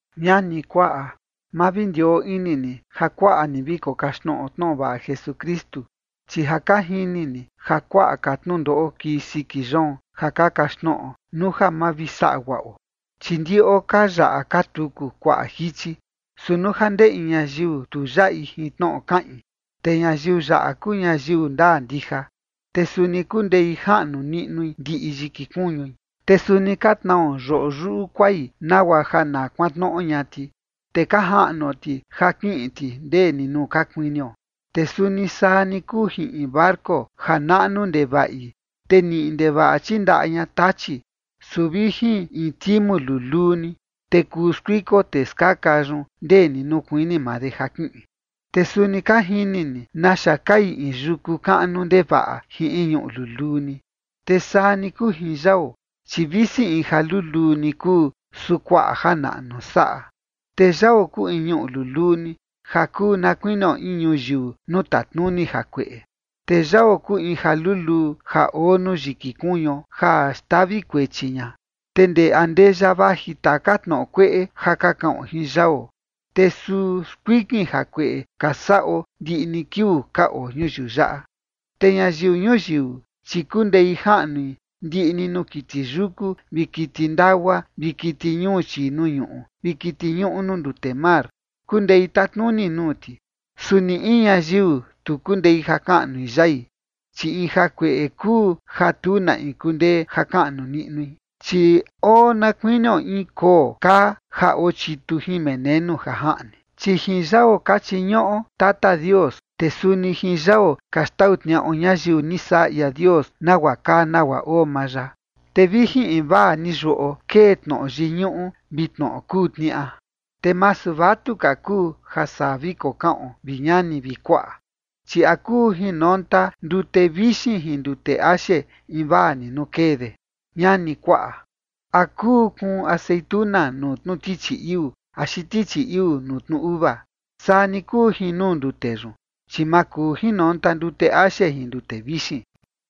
Ñani, kuaꞌa, ma vi ndioo ini ni ja kuaꞌa ni vi kokaxtnoꞌo tnoꞌo vaꞌa Jesukristu, chi ja ka jini ni ja kuaꞌa ka tnundoꞌo kii siki yoon, ja ka kaxtnoꞌo nuu ja ma vi saꞌa guaꞌo. Chi ndiꞌo ka yaꞌa ka tuku kuaꞌa jichi. Su nuu ja ndee in ñayiu tu yaꞌi jin tnoꞌo kaꞌin, te ñayiu yaꞌa kuu ñayiu ndaa ndija, te suni kundei jaꞌnu niꞌnui ndiꞌi yiki kuñui. Te suni ka tnao yoꞌo yuꞌu kuai nagua ja na kuantnoꞌo ña ti, te ka jaꞌnuo ti ja kiꞌin ti ndee ni nuu ka kuinio. Te suni saa ni kuu jin in barco ja naꞌnu ndevaꞌi, te niꞌi ndevaꞌa chindaꞌa ña tachi, su vi jin in timu luluu ni, te kuu skuiko tee skaka yun ndee ni nuu kuini maa de ja kiꞌin. Te suni ka jini ni naxa kai in yuku kaꞌnu ndevaꞌa jin in ñuꞌu luluu ni. Te saa ni kuu jin yao, chi visi in ja luluu ni kuu, su kuaꞌa janaꞌnu saꞌa. Te yao kuu in ñuꞌu luluu ni, ja kuu na kuinio in ñuyiu nuu tatnuni jakueꞌe. Te yao kuu in ja luluu ja oo nuu yiki kuñuo ja xtavi kuechi ña. Te ndee andeya vaji taka tnoꞌo kueꞌe ja ka kaꞌon jin yao, te suu skuikin jakueꞌe ka saꞌo ndiꞌi ni kiuu ka oo ñuyiu yaꞌa. Te ñayiu ñuyiu, chi kundei jaꞌnui ndiꞌi ni nuu kiti yuku, vi kiti ndagua, vi kiti ñuu chii nuu ñuꞌu, vi kiti ñuꞌu nuu ndute mar, kundei tatnuni nuu ti. Su ni in ñayiu tu kundei ja kaꞌnui yai, chi in jakueꞌe kuu ja tu na in kundee ja kaꞌnu niꞌnui, chi oo na kuinio in koo kaa ja ochitu jin menenu ja jaꞌni. Chi jin yao ka chiñuꞌo Tata Dios, te suni jin yao ka xtau tniaꞌo ñayiu ni saꞌa ia Dios, nagua kaa nagua oo maa ya. Te vi jin invaa ni yuꞌo kee tnoꞌo yiñuꞌu vi tnoꞌo kuu tniaꞌa. Te masu vatuka kuu ja saa vi kokaꞌon, vi ñani vi kuaꞌa. Chi ¿a kuu jinonta ndute vixin jin ndute axe invaa ni nuu kee de? Ñani, kuaꞌa, ¿a kuu kuun aceituna nuu tnu tichi iuu axi tichi iuu nuu tnu uva? Saa ni kuu jin nuu ndute yun, chi ma kuu jinonta ndute axe jin ndute vixin.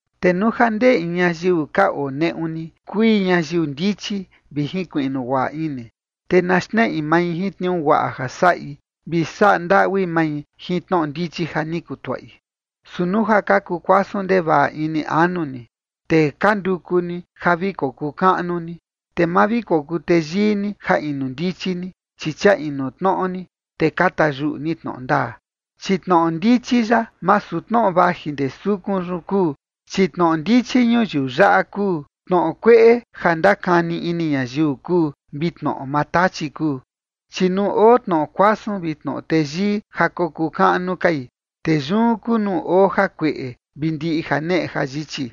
Te nuu ja ndee in ñayiu ka oo neꞌu ni kui ñayiu ndichi vi jinkuiꞌnu guaꞌa ini, te na xneꞌi mai jin tniuu guaꞌa ja saꞌi vi saꞌa ndaꞌui mai jin tnoꞌo ndichi ja ni kutuaꞌi. Su nuu ja ka kukuasun ndevaꞌa ini anu ni, te ka nduku ni ja vi kokuu kaꞌnu ni, te ma vi kokuu teyii ni ja inu ndichi ni, chi chia inu tnoꞌo ni, te ka tayuꞌu ni tnoꞌo ndaa. Chi tnoꞌo ndichi yaꞌa masu tnoꞌo vaji ndee sukun yun kuu, chi tnoꞌo ndichi ñuyiu yaꞌa kuu, tnoꞌo kueꞌe ja ndakani ini ñayiu kuu, vi tnoꞌo maa Tachi kuu. Chi nuu oo tnoꞌo kuasun vi tnoꞌo teyii ja kokuu kaꞌnu kai, te yun kuu nuu oo jakueꞌe vi ndiꞌi janeꞌe jayichi.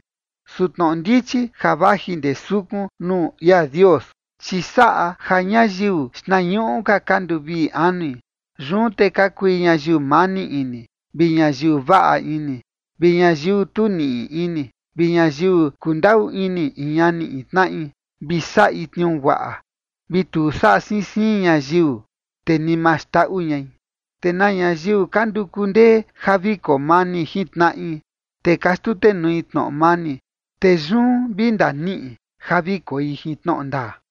Su tnoꞌo ndichi ja vaji ndee sukun nuu ia Dios, chi saꞌa ja ñayiu xtnañuꞌu ka ka nduvii anui, yun te ka kui ñayiu mani ini, vi ñayiu vaꞌa ini, vi ñayiu tu niꞌi ini, vi ñayiu kundaꞌu ini in ñani in tnaꞌi, vi saꞌi tniuu guaꞌa, vi tu saꞌa siin siin ñayiu, te ni ma xndaꞌu ñai. Te na ñayiu ka nduku ndee ja vi koo mani jin tnaꞌi, te ka xtutenui tnoꞌo mani, te yun vi ndaniꞌi ja vi koi jin tnoꞌo ndaa.